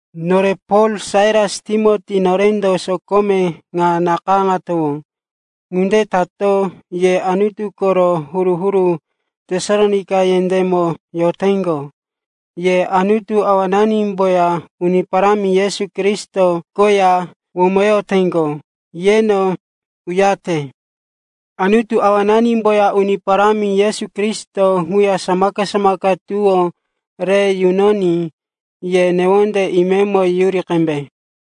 Nore Pol, Sailas, Timoti, norendo sokome ŋa nakayáŋatowó. Ŋunde tato ye Anutu koro huru-huru Tesalonaika yendémo yoteŋgo, ye Anutu Awananimboya Uni Parámi Yesu Kristo koya womoyoteŋgo, yeno uyarete. Anutu Awananimboya Uni Parámi Yesu Kristo ŋuya samaka-samaka tuwó re yunoní ye newonde imemo yuri qembe.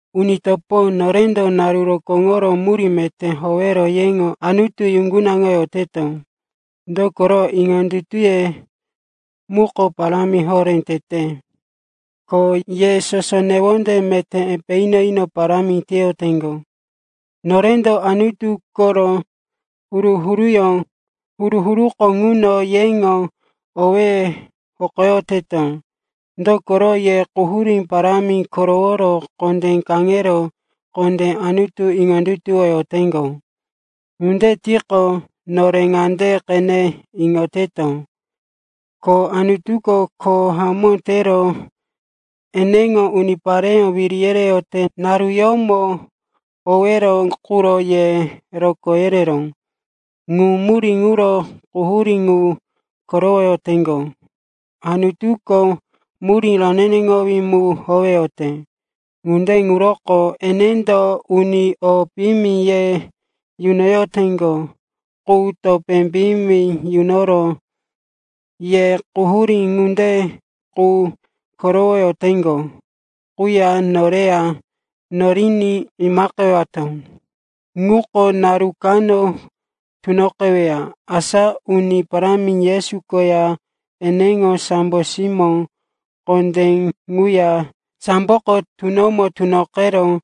Uni topo, norendo naru rokóŋoro murí meté howero yeŋo Anutu yuŋgunaŋoyoteto. Dokoro, iŋondutuye muko parámi horé tete, ko ye soso newonde meté epe ino-ino parámi teyoteŋgo. Norendo Anutu koro huru-huruko ŋuno yeŋo owéye hokoyoteto. Dokoro ye quhurí parámi koroworo kondé kaŋero kondé Anutu iŋondutuwoyoteŋgo. Ŋunde tiqo, nore ŋande qene iŋoyoteto, ko Anutuko kho hamó tero eneŋo unipareyó wiri yereyote naruyómo owero quro ye rokó yereró. Ŋu murí ŋuro quhurí ŋu korowoyoteŋgo. Anutuko murí roneneŋowí mu howeyote. Ŋunde ŋuroko enendo uni o piyimi ye yunoyoteŋgo qu topé piyimi yunoro ye quhurí ŋunde qu korowoyoteŋgo quya noreya yoriní imaqewato. Ŋuko naru kano tunoqeweya, asa Uni Parámi Yesu koya eneŋo sambo simó kondé ŋuya sambo koŋgo tunomo tunoqero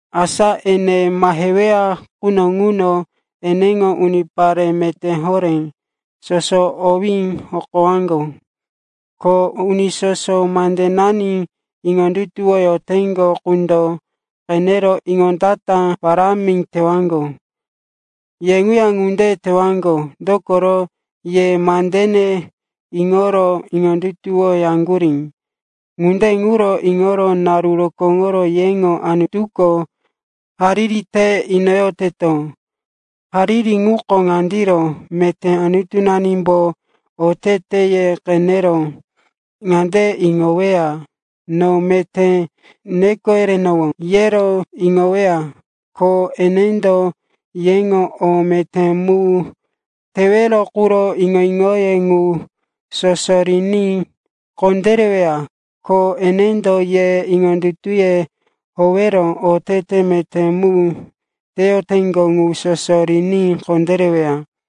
Asa ene maheweya quno ŋuno eneŋo unipare meté horé soso owí hokowaŋgo, ko uni soso mandenani iŋondutuwoyoteŋgo qundo qenero iŋondata parámi tewaŋgo. Ye ŋuya ŋunde tewaŋgo, dokoro, ye mandene iŋoro iŋondutuwoyaŋgurí. Ŋunde ŋuro iŋoro naru rokóŋoro yeŋo Anutuko hariri te inoyoteto. Hariri ŋuko ŋandiro, meté Anutunanimbo oteteye qenero ŋande iŋoweya, no meté neko yerenowó, yero iŋoweya. Ko enendo yeŋo o meté mu tewero quro iŋo-iŋoye ŋu soso riní kondéreweya, ko enendo ye iŋondutuye howero otete meté mu teyoteŋgo ŋu soso riní kondéreweya.